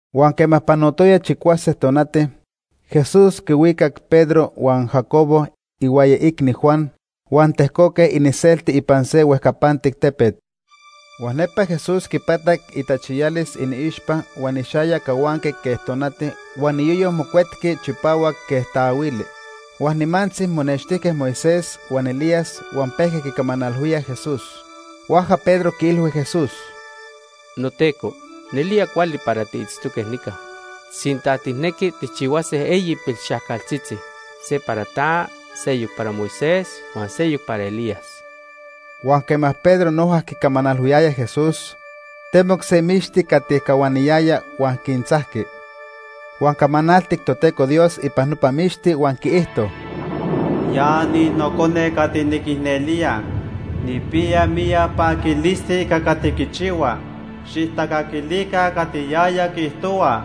Huan quema panotoya chicuase tonati, Jesús quihuicac Pedro huan Jacobo ihuaya iicni Juan, huan tejcoque iniselti ipan se huejcapantic tepet. Huan nepa Jesús quipatac itachiyalis iniixpa huan ixayac cahuanqui quej tonati huan iyoyo mocuetqui chipahuac quej taahuili. Huan nimantzi monextijque Moisés huan Elías huan pejque quicamanalhuíaj Jesús. Huajca Pedro quiilhui Jesús: ―NoTeco, nelía cuali para tiitztoque nica. Sinta tijnequi, tijchihuase eyi pilxajcaltzitzi. Se para ta, seyoc para Moisés, huan seyoc para Elías. Huan quema Pedro noja quicamanalhuiyaya Jesús, temoc se mixti cati cahuaniyaya huan quintzajqui. Huan camanaltic Toteco Dios ipan nopa mixti huan quiijto: “Ya ni Nocone cati niquicnelía. Nijpiya miyac paquilisti ica cati quichihua. Xijtacaquilica cati yaya quiijtohua.”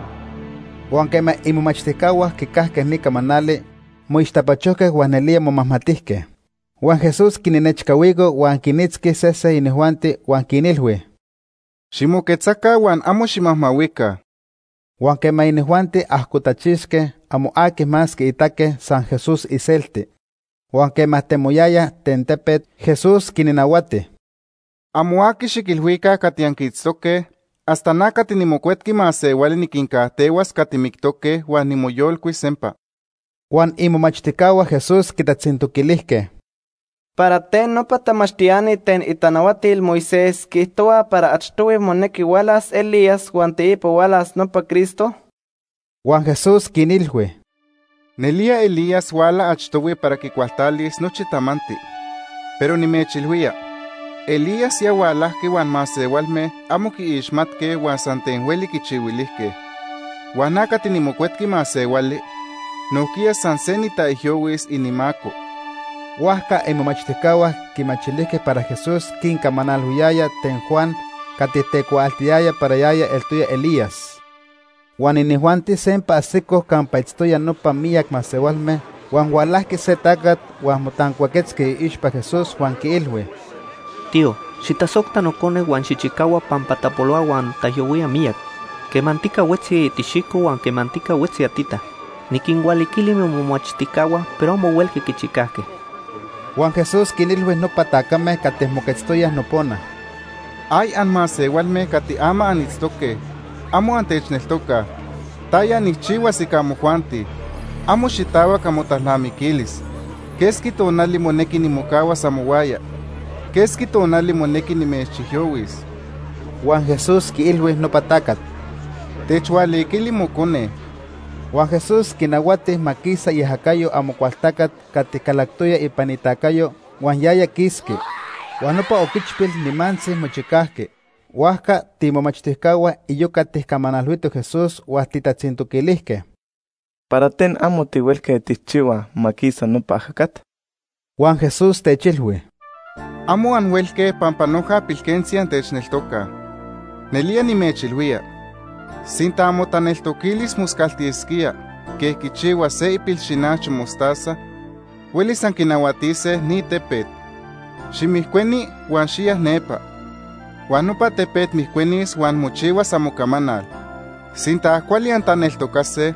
Huan quema imomachtijcahua quicajque ni camanali, moixtapachojque huan nelía momajmatijque. Huan Jesús quinnechcahuico huan quinitzqui sese inijuanti huan quinilhui: ―Ximoquetzaca huan amo ximajmahuica. Huan quema inijuanti ajcotachixque, amo aqui más quiitaque, san Jesús iselti. Huan quema temoyayaj ten tepet, Jesús quinnahuati: ―Amo aqui xiquilhuica cati anquiitztoque hasta na cati niMocuetqui Masehuali niquincajtehuas cati mictoque huan nimoyolcuis sempa. Huan imomachtijcahua Jesús quitatzintoquilijque: ―¿Para ten nopa tamachtiani ten itanahuatil Moisés quiijtohuaj para achtohui monequi hualas Elías huan teipa hualas nopa Cristo? Huan Jesús quinilhui: ―Nelía Elías huala achtohui para quicualtalis nochi tamanti. Pero nimechilhuía, Elías ya hualajqui huan masehualme amo quiixmatque huan san ten hueli quichihuilijque. Huan na cati niMocuetqui Masehuali nojquiya san se nitaijyohuis inimaco. Huajca imomachtijcahua quimachilijque para Jesús quincamanalhuiyaya ten Juan cati tecuaaltiyaya para yaya eltoya Elías. Huan inijuanti sempa ajsicoj campa itztoyaj nopa miyac masehualme, huan hualajqui se tacat huan motancuaquetzqui iixpa Jesús huan quiilhui: ―Tío, xijtasojta nocone huan xijchicahua pampa tapolohua huan taijyohuía miyac. Quemantica huetzi tixijco huan quemantica huetzi atita. Niquinhualiquili momomachtijcahua pero amo huelque quichicajque. Huan Jesús quinilhui nopa tacame cati moquetztoyaj nopona: ―¡Ay anmasehualme cati ama anitztoque, amo antechneltoca! ¿Taya nijchihuas ica amojuanti? Amo xitahuac amotalnamiquilis. ¿Quesqui tonali monequi nimocahuas amohuaya? ¿Quesqui tonali monequi nimechijyohuis? Huan Jesús quiilhui nopa tacat: ―Techhualiquili mocone. Huan Jesús quinahuati ma quisa iajacayo Amocualtacat cati calactoya ipan itacayo, huan yaya quisqui. Huan nopa oquichpil nimantzi mochicajqui. Huajca tiimomachtijcahua iyoca tijcamanalhuitoj Jesús huan tijtatzintoquilijque: ―¿Para ten amo tihuelque tijchihuaj ma quisa nopa ajacat? Huan Jesús techilhui: ―Amo anhuelque pampa noja pilquentzi antechneltocaj. Nelía nimechilhuía, sinta amotaneltoquilis moscaltisquía quej quichihua se ipilxinacho mostaza, huelis anquinahuatise ni tepet: ‘Ximijcueni huan xiya nepa’, huan nopa tepet mijcuenis huan mochihuas amocamanal. Sinta cuali antaneltocase,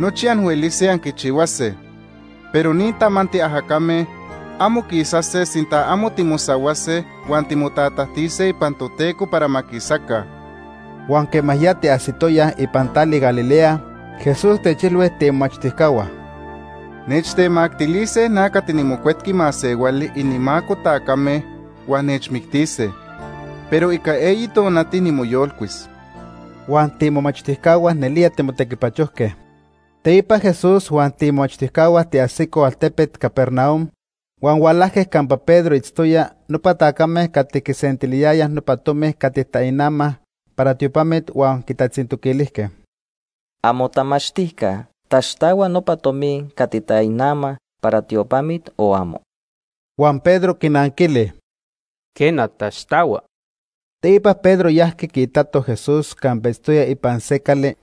nochi anhuelise anquichihuase. Pero ni tamanti ajacame amo quisase sinta amo timosahuase huan timotatajtise ipan Toteco para ma quisaca. Huan quema ya tiajsitoyaj ipan tali Galilea, Jesús techilhui tiimomachtijcahua: ―Nechtemactilise na cati niMocuetqui Masehuali inimaco tacame, huan nechmictise, pero ica eyi tonati nimoyolcuis. Huan tiimomachtijcahua nelía timotequipachojque. Teipa Jesús huan tiimomachtijcahua tiajsicoj altepet Capernaum, huan hualajque campa Pedro itztoya nopa tacame cati quisentiliyayaj nopa tomi cati tainamaj para tiopamit huan quitatzintoquilijque: ―¿Amotamachtijca taxtahua nopa tomi cati tainamaj para tiopamit o amo? Huan Pedro quinanquili: ―Quena, taxtahua. Teipa Pedro yajqui quiitato Jesús campa itztoya ipan se cali.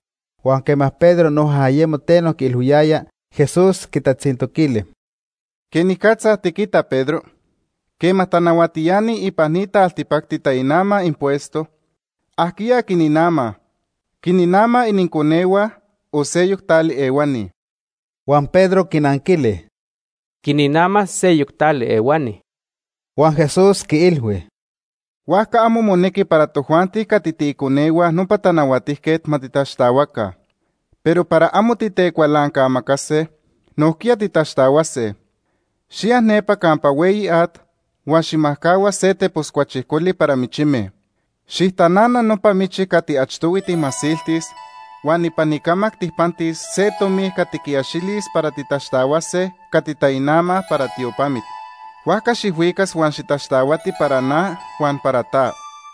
Huan quema Pedro noja ayemo teno quiilhuiyaya, Jesús quitatzintoquili: ―¿Quenicatza tiquita, Pedro? Quema tanahuatiani ipan ni taltipacti tainamaj impuesto, ¿ajquiya quininamaj? ¿Quininamaj ininconehua o seyoc tali ehuani? Huan Pedro quinanquili: ―Quininamaj seyoc tali ehuani. Huan Jesús quiilhui: ―Huajca amo monequi para tojuanti cati tiiconehua nopa tanahuatijquet ma titaxtahuaca. Pero para amo titecualancamacase, nojquiya titaxtahuase. Xiya nepa campa hueyi at huan xijmajcahua se tepos cuachijcoli para michime. Xijtanana nopa michi cati achtohui tijmasiltis, huan ipan icamac tijpantis se tomi cati quiaxilis para titaxtahuase cati tainamaj para tiopamit. Huajca xijhuicas huan xitaxtahuati para na huan para ta.